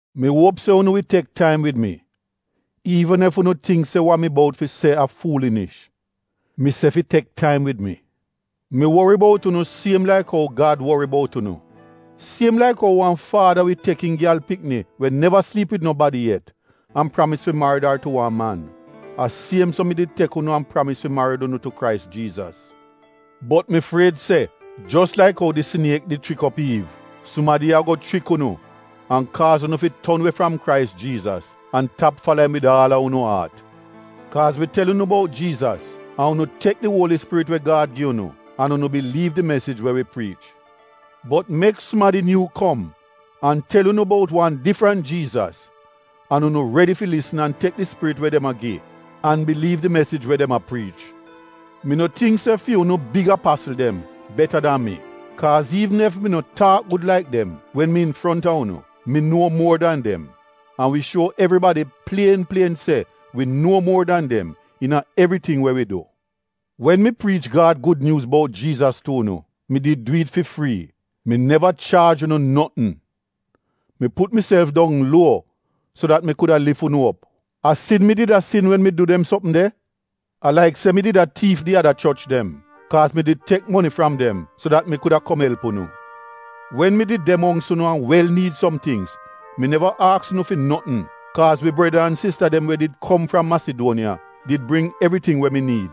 Mi uop se unu wi tek taim wid mi iivn ef unu tingk se wa mi bout fi se a fuulinish. Mi se fi tek taim wid mi! Mi wori bout unu siem laik ou Gad wori bout unu. Siem laik ou wan faada wi tek im gyal pikni we neva sliip wid nobadi yet an pramis fi marid ar tu wan man, a siem so mi did tek unu an pramis fi marid unu tu Krais Jiizas. Bot mi fried se, jos laik ou di siniek di chrik op Iiv, sumadi ago chrik unu an kaaz unu fi ton we fram Krais Jiizas an tap fala im wid aal a unu aat. Kaaz wi tel unu bout Jiizas an unu tek di Uoli Spirit we Gad gi unu an unu biliiv di mesij we wi priich. Bot mek sumadi nyuu kom an tel unu bout wan difrant Jiizas an unu redi fi lisn an tek di spirit we dem a gi an biliiv di mesij we dem a priich. Mi no tingk se fi unu “big apasl” dem beta dan mi. Kaaz iivn ef mi no taak gud laik dem wen mi infronta unu, mi nuo muor dan dem. An wi shuo evribadi plien plien se wi nuo muor dan dem iina evriting we wi du. Wen mi priich Gad Gud Nyuuz bout Jiizas tu unu, mi did du it fi frii, mi neva chaaj unu notn. Mi put miself dong luo so dat mi kuda lif unu op. A sin mi did a sin wen mi du dem sopm de? A laik se mi did a tiif di ada choch dem, kaaz mi did tek moni fram dem so dat mi kuda kom elp unu. Wen mi did de mongks unu an wel niid som tingz mi neva aks unu fi notn, kaaz wi breda an sista dem we did kom fram Masiduoniya did bring evriting we mi niid.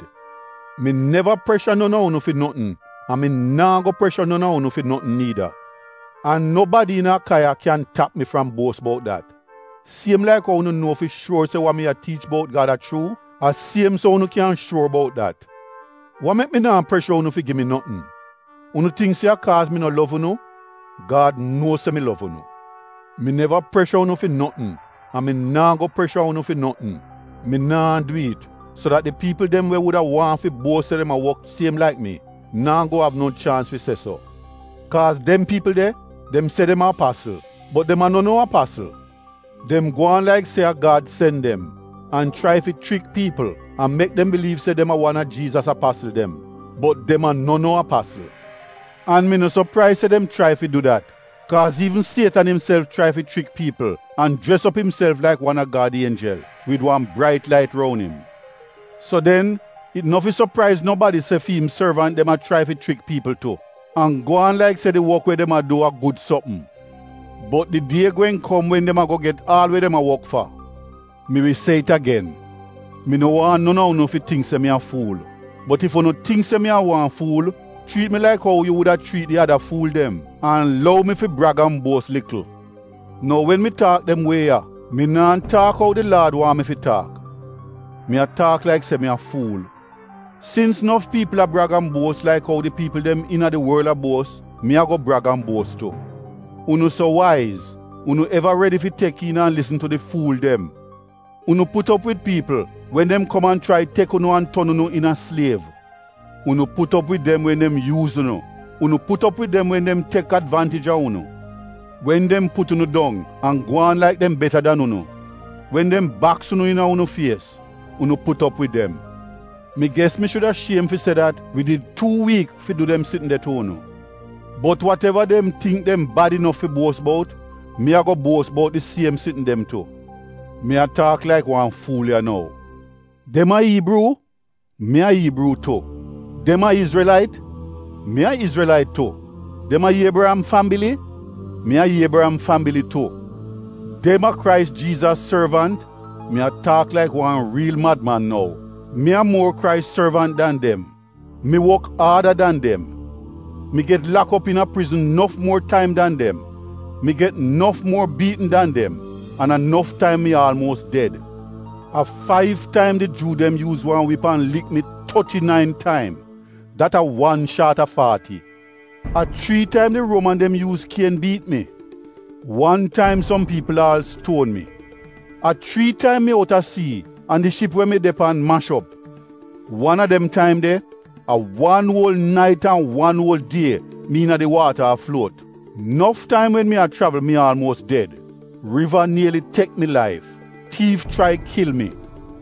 Mi neva presha non a unu fi notn an mi naa go presha non a unu fi notn niida. An nobadi iina Akaiya kyan tap mi fram buos bout dat. Siem laik ou unu nuo fi shuor se wa mi tiich bout Gad a chuu, a siem so unu kyan shuor bout dat. Wa mek mi naa presha unu fi gi mi notn? Unu tingk se a kaaz mi no lov unu? Gad nuo se mi lov unu. Mi neva presha unu fi notn an mi naa go presha unu fi notn. Mi naa du it so dat di piipl dem we wuda waahn fi buos se dem a wok siem laik mi, naa go av no chaans fi se so. Kaaz dem piipl de, dem se dem a apasl, bot dem a no no apasl. Dem gwaan laik se a Gad sen dem an chrai fi chrik piipl an mek dem biliiv se dem a wan a Jiizas apasl dem, bot dem a no no apasl. An mi no sopraiz se dem chrai fi du dat kaaz iivn sietan imself chrai fi chrik piipl an jres op imself laik wan a Gad ienjel wid wan brait lait roun im. So den it no fi sopraiz nobadi se fi im sorvant dem a chrai fi chrik piipl tu an gwaan laik se di wok we dem a du a gud sopm. Bot di die gweehn kom wen dem ago get aal we dem a wok fa. Mi wi se it agen, mi no waahn non a unu fi tingk se mi a fuul. Bot ef unu tingk se mi a wan fuul, chriit mi laik ou yu wuda chriit di ada fuul dem an lou mi fi brag an buos likl. Nou wen mi taak dem wie ya, mi naa taak ou di Laad waahn mi fi taak. Mi a taak laik se mi a fuul. Sins nof piipl a brag an buos laik ou di piipl dem iina di worl a buos, mi ago brag an buos tu. Unu so waiz, unu eva redi fi tek iin an lisn tu di fuul dem. Unu put op wid piipl wen dem kom an chrai tek unu an ton unu iina sliev. Unu put op wid dem wen dem yuuz unu, unu put op wid dem wen dem tek advaantij a unu. Wen dem put unu dong an gwaan laik dem beta dan unu, wen dem baks unu iina unu fies, unu put op wid dem. (Mi ges mi shuda shiem fi se dat wi did tuu wiik fi du dem sitn de tu unu.) Bot wateva dem tingk dem bad inof fi buos bout, mi ago buos bout di siem sitn dem tu. (Mi a taak laik wan fuul ya nou). Dem a Iibruu? Mi a Iibruu tu. Dem a Izrelait? Mi a Izrelait tu. Dem a Iebriyam fambili? Mi a Iebriyam fambili tu. Dem a Krais Jiizas sorvant? (Mi a taak laik wan riil madman nou.) Mi a muor Krais sorvant dan dem. Mi wok aada dan dem. Mi get lak op iina prizn nof muor taim dan dem. Mi get nof muor biitn dan dem an a nof taim mi aalmuos ded. A faiv taim di Juu dem yuuz wan wip an lik mi toti-nain taim — dat a wan shaat a faati. A chrii taim di Ruoman dem yuuz kien biit mi. Wan taim som piipl aal stuon mi. A chrii taim mi out a sii an di ship we mi de pan mash op. Wan a dem taim de a wan uol nait an wan uol die mi iina di waata a fluot. Nof taim wen mi a chravl, mi aalmuos ded. Riva nieli tek mi laif. Tiif chrai kil mi.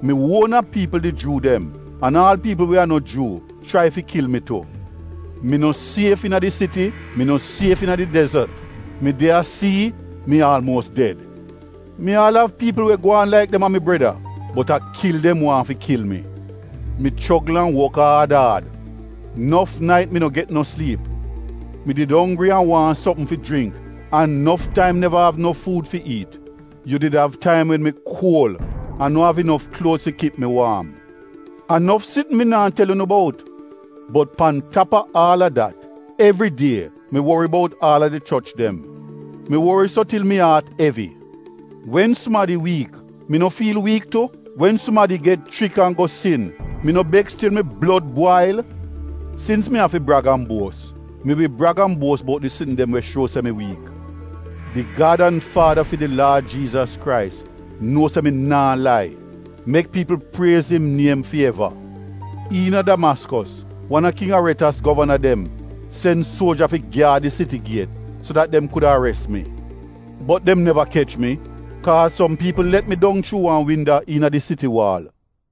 Mi uona piipl di Juu dem an aal piipl we a no Juu chrai fi kil mi tu. Mi no sief iina di siti. Mi no sief iina di dezot. Mi de a sii, mi aalmuos ded. Mi aal av piipl we gwaan laik dem a mi breda, bot a kil dem waahn fi kil mi. Mi chogl an wok aad aad, nof nait mi no get no sliip. Mi did onggri an waahn sopm fi jringk an nof taim neva av no fuud fi iit. Yu did av taim wen mi kuol an no av inof kluoz fi kip mi waam. A nof tingz mi naa tel unu bout, bot pan tap a aal a dat, evri die mi wori bout aal a di choch dem. Mi wori so til mi aat evi. Wen sumadi wiik, mi no fiil wiik tu? Wen sumadi get chrik an go sin, mi no beks til mi blod bwail? Sins mi afi brag an buos, mi wi brag an buos bout di sitn dem we shuo se mi wiik. Di Gad an Faada fi di Laad Jiizas Krais, nuo se mi naa lai. Mek piipl priez im niem fi eva! Iina Damaskos, wan a King Aretas govana dem sen suoja fi gyaad di siti giet so dat dem kuda ares mi. Bot dem neva kech mi, kaaz som piipl let mi dong chuu wan winda iina di siti waal.